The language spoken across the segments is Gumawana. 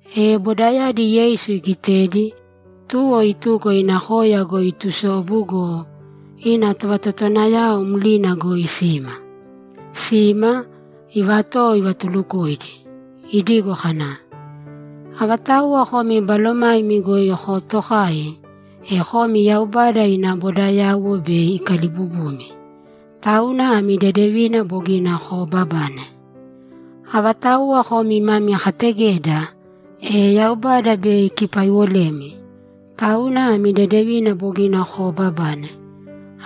E bodayadi Yeisu igitedi, tuwo ituko ina koya goi itusobu go, ina tovatotowanayao mlina goi sima. Sima, ivatowo ivatulukoidi, idigo kana, ‘Avatauwa komi balomaimi goi kootokai, e komi Yaubada ina bodayauwo bei ikalibubumi, tauna ami dedevina bogina koobabane. Avatauwa komi mami kategeda, e Yaubada bei ikipaiwolemi, tauna ami dedevina bogina koobabane.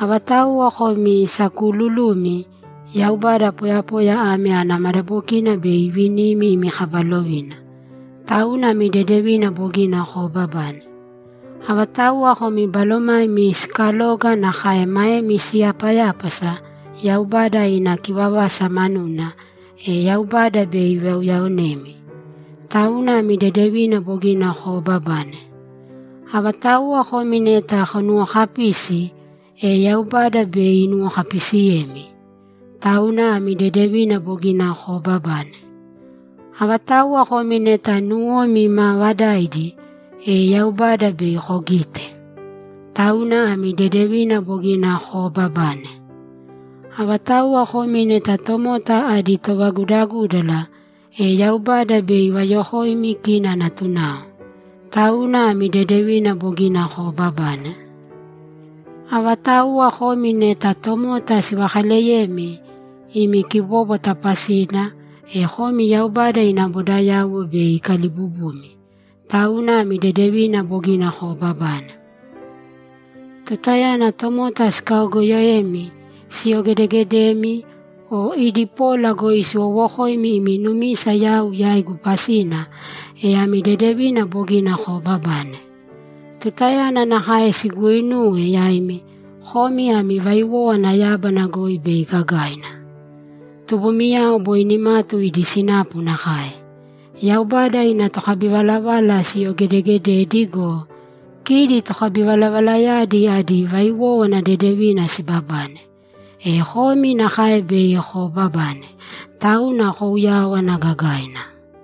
Avatauwa komi sakuululumi, e Yaubada poyapoya ame ana madabokina bei ivinimi imi kaba lovina, tauna ami dedevina bogina koobabane. Avatauwa komi balomaimi siikaloga nakae maemi siyapayápasa Yaubada ina kivavasa manuna, e Yaubada bei ivauyaonemi, tauna ami dedevina bogina koobabane. Avatauwa komi neta tonuwokapisi, e Yaubada bei inuwokapisiyemi, tauna ami dedevina bogina koobabane. Avatauwa komi neta nuwomi maavadaidi, e Yaubada bei kogite. Tauna ami dedevina bogina koobabane. Avatauwa komi neta tomota adi tovagudagúdala, e Yaubada bei ivayokoimi kina natunao. Tauna ami dedevina bogina koobabane. Avatauwa komi neta tomota sivakaleyemi imi kibóbwata pasina, e komi Yaubada ina bodayauwo bei ikalibubumi. Tauna ami dedevina bogina koobabane. Tutayana tomota sikaogoyoemi, siyogedegedemi, o idi pola goi siwowokoimi imi numisa yau yaigu pasina, e ami dedevina bogina koobabane. Tutayana nakae siguuinuwe yaimi, komi ami vaiwówana yábana goi bei gagaina. Tubumiyao boi nimatu idi sinapu nakae. Yaubada ina tokabivalavala siyogedegededi go, kidi tokabivalavalayadi adi vaiwówana dedevina sibabane. E komi nakae bei koobabane. Tauna kouyāwana gagaina.’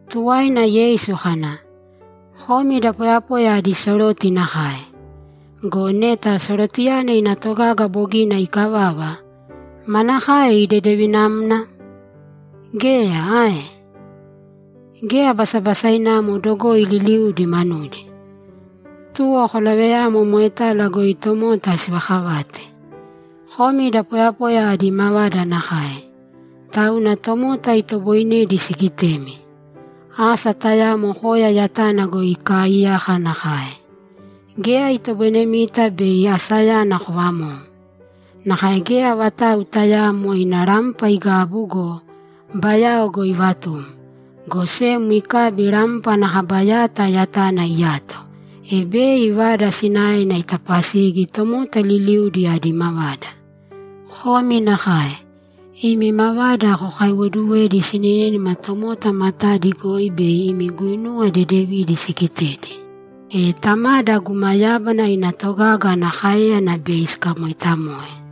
Tuwaina Yeisu kana, ‘Komi da poyapoya adi soroti nakae. Go neta sorotiyana ina togaga bogina ikavava, manakaena idedevinamna? Geya ae? Geya basabasainamo dogoi liliudi manudi. Tuwo kolaveyāmo moetala goi tomota sivakavate. Komi da poyapoya adi mavada nakae, tauna tomota itoboinedi sigitemi. Asa tayamo koya yatana goi ikaaiyaka nakae. Geya itoboinemita bei asayana kovamou. Nakae geya vatau tayaamo ina rampa igabu go, bayao goi ivatum, go sem ikabi rampa ana kaba yata yatana iyato, e bei vada sinaena itapasigi tomota liliudi adi mavada. Komi nakae. Imi mavada kokaiwoduwēdi sininínima tomota matadi goi bei imi guinuwa dedevidi sigitedi, e Tamada guma yábana ina togaga ana káeyana bei sikamoitamoe.’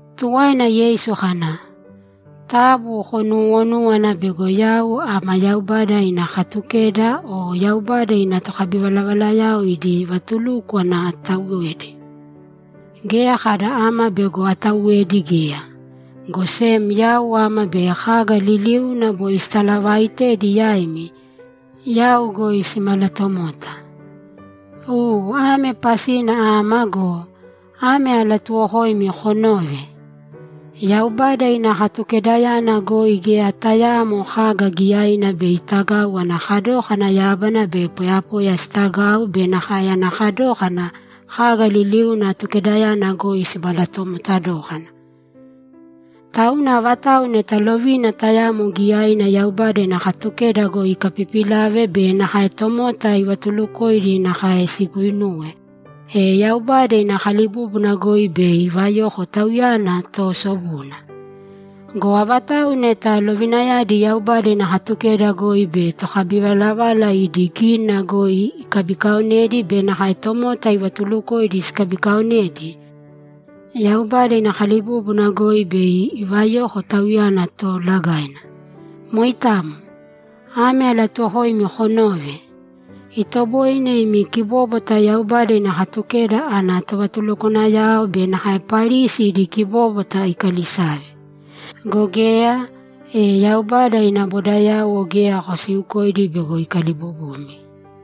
Tuwaina Yeisu kana, ‘Taabu konuwonūwana bego yau ama Yaubada ina Katukeda o Yaubada ina tokabivalavalayao idi vatulúkwana atauwedi. Geya kada ama bego atauwedi geya, go sem yau ama bei kaga liliuna boi sitalavaaitedi yaimi, yau goi simalatomota. U ame pasina ama go, ame alatuuwokoimi konōve: Yaubada ina Katukedayana goi geya tayaamo kaga giyaina bei itagau ana kadókana yábana be poyapoya sitagau be nakae ana kadókana kaga liliuna Atukedayana goi simalatomota dókana. Tauna avatau neta lovina tayamo giyaina Yaubada ina Katukeda goi ikapipilave be nakae tomota ivatulukoidi nakae siguuinuwe, e Yaubada ina kalibúbuna goi bei ivayoko tauyana toosobuna. Go avatau neta lovinayadi Yaubada ina Katukeda goi be tokabivalavala idi gínina goi ikabikaonedi be nakae tomota ivatulukoidi sikabikaonedi, Yaubada ina kalibúbuna goi bei ivayoko tauyana toolagaina. Moitamo. Ame alatuuwokoimi konōve: Itoboine imi kibóbwata Yaubada ina Katukeda ana tovatulukwanayao be nakae Parisi idi kibóbwata ikalisave. Go geya, e Yaubada ina bodayauwo geya kosiiukoidi bego ikalibubumi.’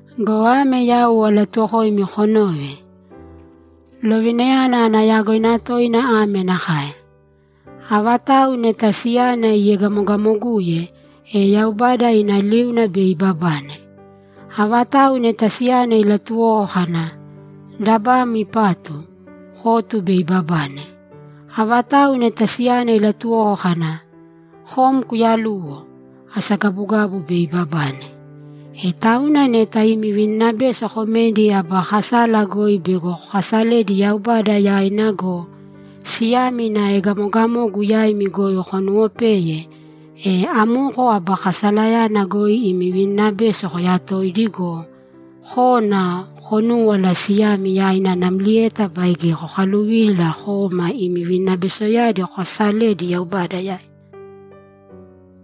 Go ame yau alatuuwokoimi konōve: Lovinayana ana yagoina toina ame nakae: Avatau neta siyana iegamogamoguye, e Yaubada ina liuna bei ibabane. Avatau neta siyana ilatuwoko kana, “Dabam ipatu”, kotu bei ibabane. Avatau neta siyana ilatuwoko kana, “Kom kuyaluwo”, asagabugabu bei ibabane. E tauna neta imi vininabeso komedi aba kasala goi bego kokasaledi Yaubada yaina go, siyami ina egamogamogu yaimi goi konuwopeye, e amoko aba kasalayana goi imi vininabeso koyatōidi go, kōna konūwala siyami yaina namlieta baige kokaluvīla kōma imi vininabesoyadi kokasalēdi Yaubada yaina.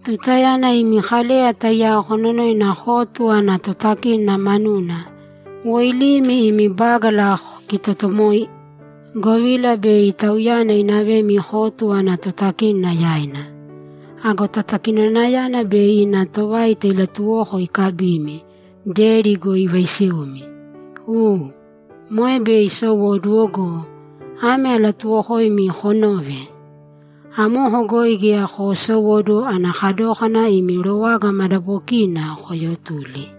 Tutayana imi kaleya taiyao kononoina kotu ana totakínona manuna, woilīmi imi bágala kokitotomōi, govila bei tauyana inavemi kotu ana totakínona yaina. Ago totakinonayana bei ina tovaita ilatuwoko ikabimi, deri goi ivaisiumi. U, moe bei isowóduwo go, ame alatuuwokoimi konōve: Amoko goi geya koosowóduwo ana kadókana imi rowaga madabokiina koyotuli.’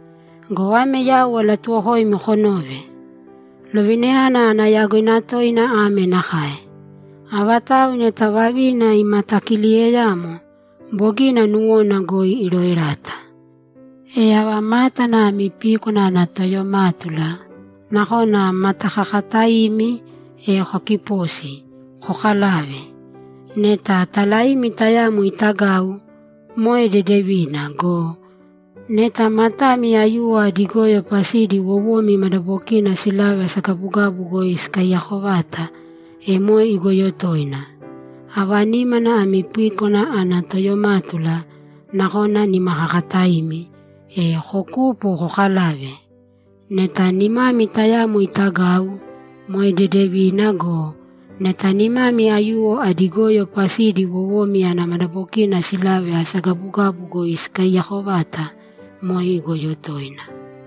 Go ame yau alatuuwokoimi konōve: Lovinayana ana yagoina toina ame nakae: Avatau neta vavina imatakililiyeyamo, bogina nuwona goi iroerata. E ava mátana ami píkwana ana toyomátula, nakona matakakataimi, e kokipōsi, kokalāve. Neta talaimi tayamo itagau, moe dedevina go, neta matami aiyuwo adi goyo pasidi wowomi madabokina silave asagabugabu goi sikaiyako vata, e moe igoyo toina. Ava nímana ami píkwana ana toyomátula, nakona nimakakataimi, e kokūpo kokalāve. Neta nimami tayamo itagau, moe dedevina go, neta nimami aiyuwo adi goyo pasidi wowomi ana madabokina silave asagabugabu goi sikaiyako vata, moe igoyo toina.’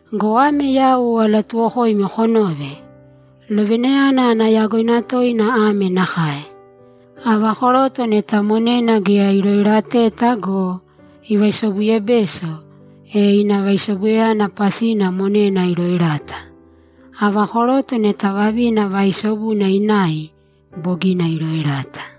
o ame yau alatuuwokoimi konōve: Lovinayana ana yagoina toina ame nakae: Ava koroto neta monena geya iroerateta go, ivaisobuyebeso, e ina vaisobubesoyana pasina monena iroerata. Ava koroto neta vavina vaaisobuna inai, bogina iroerata.’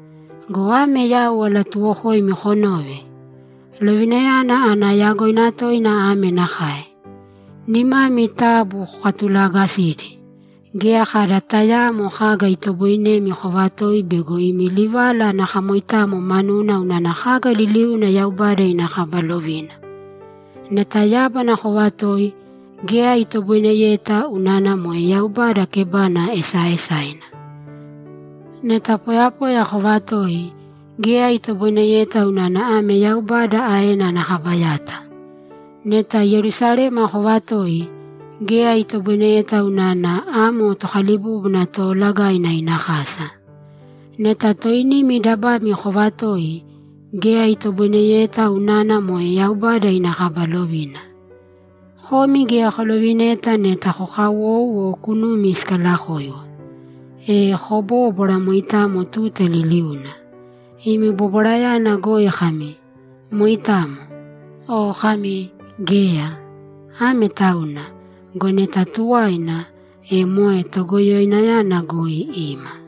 Go ame yau alatuuwokoimi konōve: Lovinayana ana yagoina toina ame nakae: Nimami taabu kokatulaagasīdi. Geya kada tayaamo kaga itoboinemi kovatoi bego imi livala ana kamoitamo manuna unana kaga liliuna Yaubada ina kaba lovina. Neta yábana kovatoi, geya itoboineyeta unana moe Yaubada kebana esaaesaina. Neta poyapoya kovatoi, geya itoboineyeta unana ame Yaubada aena ana kaba yata. Neta Yerusalema kovatoi, geya itoboineyeta unana amo Tokalibúbuna Toolagaina ina kasa. Neta toinimi dabami kovatoi, geya itoboineyeta unana moe Yaubada ina kaba lovina. Komi geya kolovineta neta kokawou o kunumi sikalakoiwo. E kobōbwara moitamo tuta liliuna. Imi bobwarayana goi kami, “Moitamo.” O kami, “Geya.” Ame tauna. Go neta tuwaina, e moe Togoyoinayana goi ima.’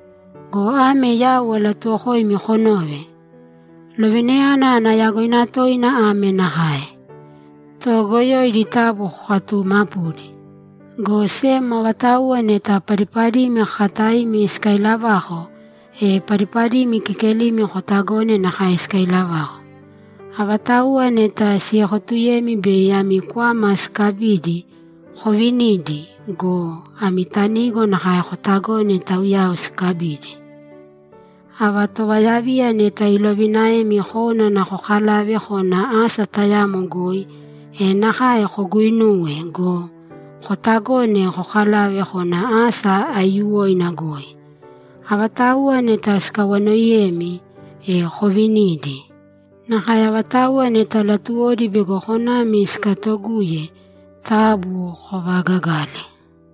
Go ame yau alatuuwokoimi konōve: Lovinayana ana yagoina toina ame nakae: Toogoyoidi taabu kokatuumapūdi, go sem avatauwa neta padipadimi kakataimi sikailavako, e padipadimi kekelimi kotagōne nakae sikailavako. Avatauwa neta siekotuyemi bei ami kwama sikabidi, kovinīdi go, ami tanigo nakae kotagōne taiyao sikabidi. Ava tovayaviya neta ilovinaemi konana kokavale kona asa tayamo goi, e nakae koguinūwe go, kotagōna kokavale kona asa aiyuwoina goi. Avatauwa neta sikawanoiyemi, e kovinīdi. Nakae avatauwa neta latuwodi bego konami sikatoguye, taabu kovaagagāle.’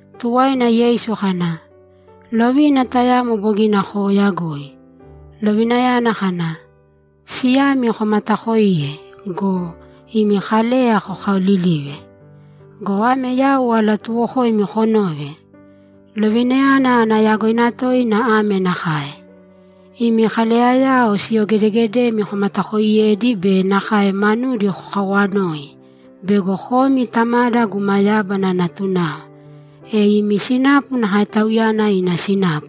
Tuwaina Yeisu kana, ‘Lovina tayamo bogina kooyagoi, lovinayana kana, “Siyami komataakoīye” go, imi kaleya kokaolilīve. Go ame yau alatuuwokoimi konōve: Lovinayana ana yagoina toina ame nakae: Imi kaleyayao siyogedeegedemi komatakoiyēdi be nakae manudi kokawanōi bego komi Tamada guma yábana natunao, e imi sinapu nakae Tauyana ina sinapu.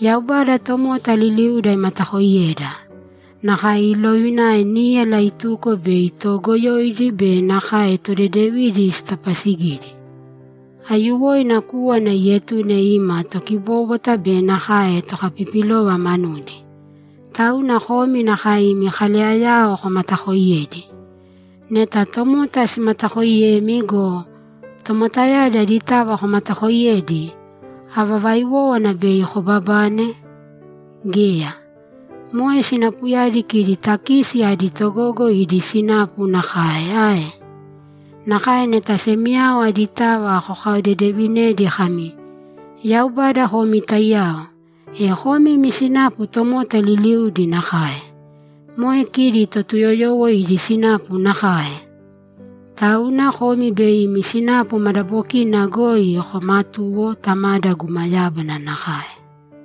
Yaubada tomota liliuda imatakoiyeda. Nakae iilovina níyala ituko bei toogoyoidi be nakae todedevidi itapasigidi. Aiyuwoina kúwana iietune ima tokibóbwata be nakae tokapipilova manudi. Tauna komi nakae imi kaleyayao komatakoiyēdi. Neta tomota simatakooiyemi go, tomotayadi aditava komatakooiyedi, ava vaiwówana bei kobabane? Geya. Moe sinapuyana kidi takisi adi togogo idi sinapu nakae ae? Nakae neta semiyao aditava kokaodedevinedi kami, “Yaubada komi taiyao”, e komi imi sinapu tomota liliudi nakae. Moe kidi Totuyoyowo idi sinapu nakae! Tauna komi bei imi sinapu madabokina goi komatūwo, Tamada guma yábana nakae.’